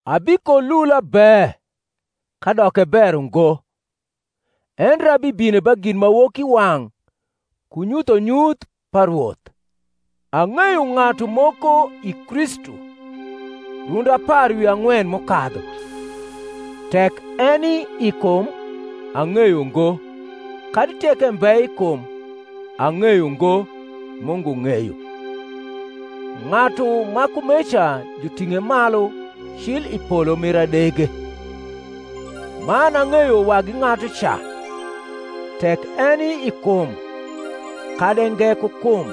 Abikolula be, kadok e ber ungo; endre abibino ba ginmawokiwang’ ku nyuthonyuth pa Rwoth. Ang’eyo ng’atu moko i Kristu, rundi apar wi ang’wen m’ukadhu (tek eni i kum, ang’eyo ngo; kadi tek embe i kum, ang’eyo ngo; Mungu ng’eyo), ng’atu ma kumeca juring’e malu cil i polo mir adege. Man ang’eyo wagi ng’atuca (tek eni i kum, kadi e nge ku kum,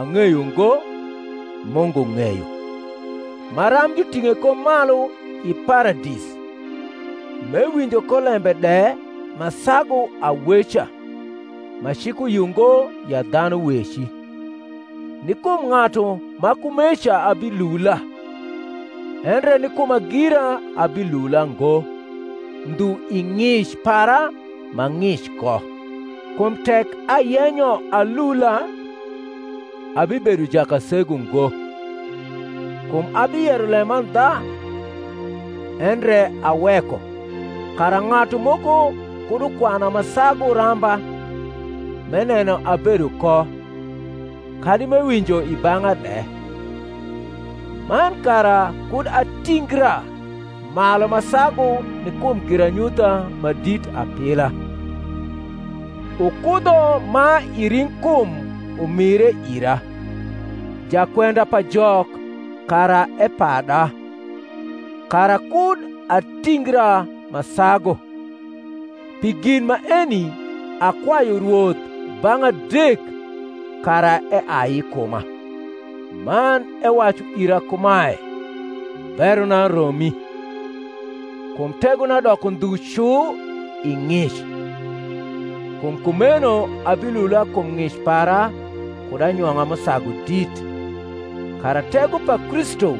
ang’eyo ngo; Mungu ng’eyo), maram juting’e ko malu i Paradis, m’ewinjo ko lembe de ma sagu aweca, ma cik uyio ngo ya dhanu weci. Ni kum ng’atu ma kumeca abilula: endre ni kuma gira abilula ngo, ndhu i ng’ic para m’a ng’ic ko. Kum tek ayenyo alula, abibedo jakasegu ngo; kum abiyero lemandha; endre aweko, kara ng’atu moko kud ukwana ma sagu ramba m’eneno abedo ko, kadi m’ewinjo i bang’a de. Man kara kud atingra malu ma sagu ni kum giranyutha ma dit apila, ukudho ma i ring’kum umire ira, jakwenda pa Jok kara epada, kara kud atingra ma sagu. Pi gin maeni akwayu Rwoth bang’ adek, kara eai i kuma. Man ewacu ira kumae, Berona romi: kum tegona doko ndhu cu i ng’ic. Kum kumeno abilula kum ng’ic para kud anyong’a m’usagu dit, kara tego pa Kristu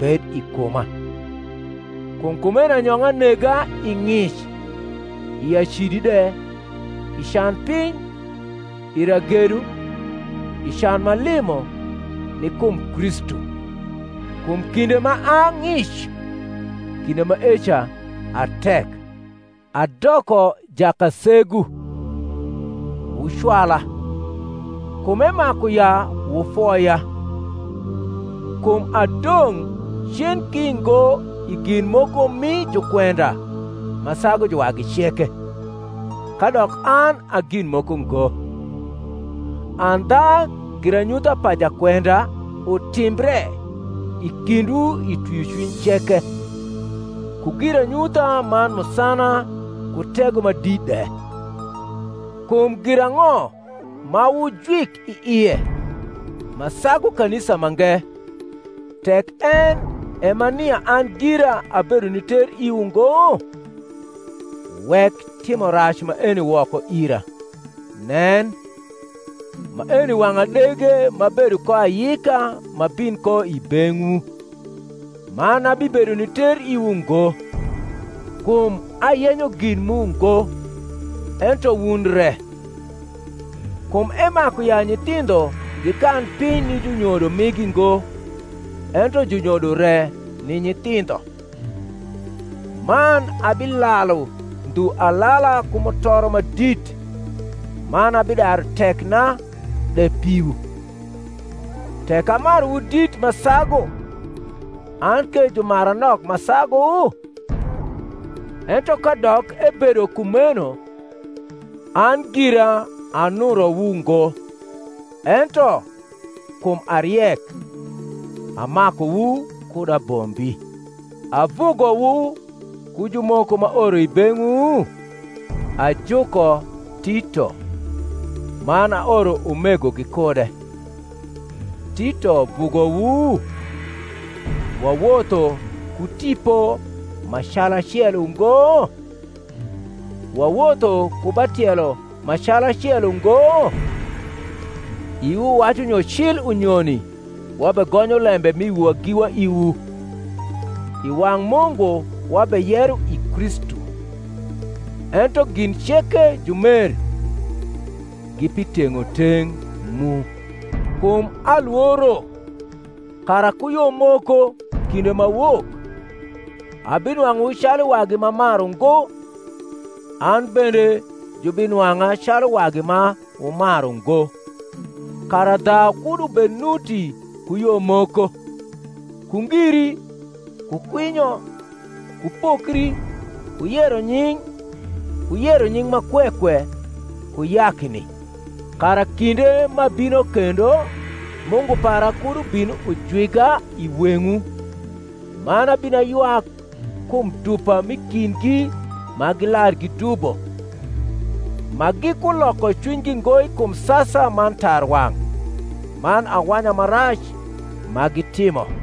bed i kuma. Kum kumeno anyong’a nega i ng’ic, i acidi de, i can piny, i ragedo, i can m’alimo, ni kum Kristu: kum kinde ma a ng’ic, kinde maeca a tek. Adoko jakasegu: wucwala; kum emaku ya wufoya: kum adong’ cen ki ngo i gin moko mi jukwenda ma sagu juwagi ceke, kadok an a gin moko ngo. Andha giranyutha pa jakwenda utimbre i kindwu i twiocwiny ceke, ku giranyutha man musana ku tego ma dit de. Kum girang’o ma wujwik i ie ma sagu kanisa mange, tek en e ma nia an gira abedo ni ter iwu ngo? wek timo rac maeni woko ira. Nen, maeni wang’ adege m’abedo ko ayika m’abin ko i beng’wu; man abibedo ni ter iwu ngo: kum ayenyo gin mu ngo, ento wun re: kum emaku ya nyithindho gikan piny ni junyodo migi ngo, ento junyodo re ni nyithindho. Man abilalu ndhu alala ku mutoro ma dit man abidaru tekna de piwu. Tek amaruwu dit ma sagu, an ke jumara nok ma sagu? Ento kadok ebedo kumeno, an gira anurowu ngo; ento, kum a riek, amakuwu kud abombi. Avugowu ku jumoko m’aoro i beng’wu? Ajuko Tito, man aoro umego gikude. Tito vugowu? wawotho ku tipo ma calacel ungo? wawotho ku ba tielo ma calacel ungo? Iwu wacu nyo cil unyoni wabegonyo lembe m’i wiwa giwa iwu. I wang’ Mungu wabeyero i Kristu. Ento gin ceke, jumer, gi pi teng’oteng’ mu. Kum alworo, kara ku yo moko, kinde m’awok, abinwang’uwu calu wagi m’amaru ngo, an bende jubinwang’a calu wagi ma wumaru ngo; kara dhau kud ubed nuti ku yo moko, ku ngiri, ku kwinyo, ku pokri, ku yero nying’, ku yero nying’ ma kwe kwe, ku yakni; kara kinde m’abino kendo Mungu para kud ubin ujwiga i weng’wu man abin aywak kum dupa m’i kindgi ma gilar gidubo, ma gikuloko cwinygi ngo kum sasa man tarwang’ man awanya ma rac ma gitimo.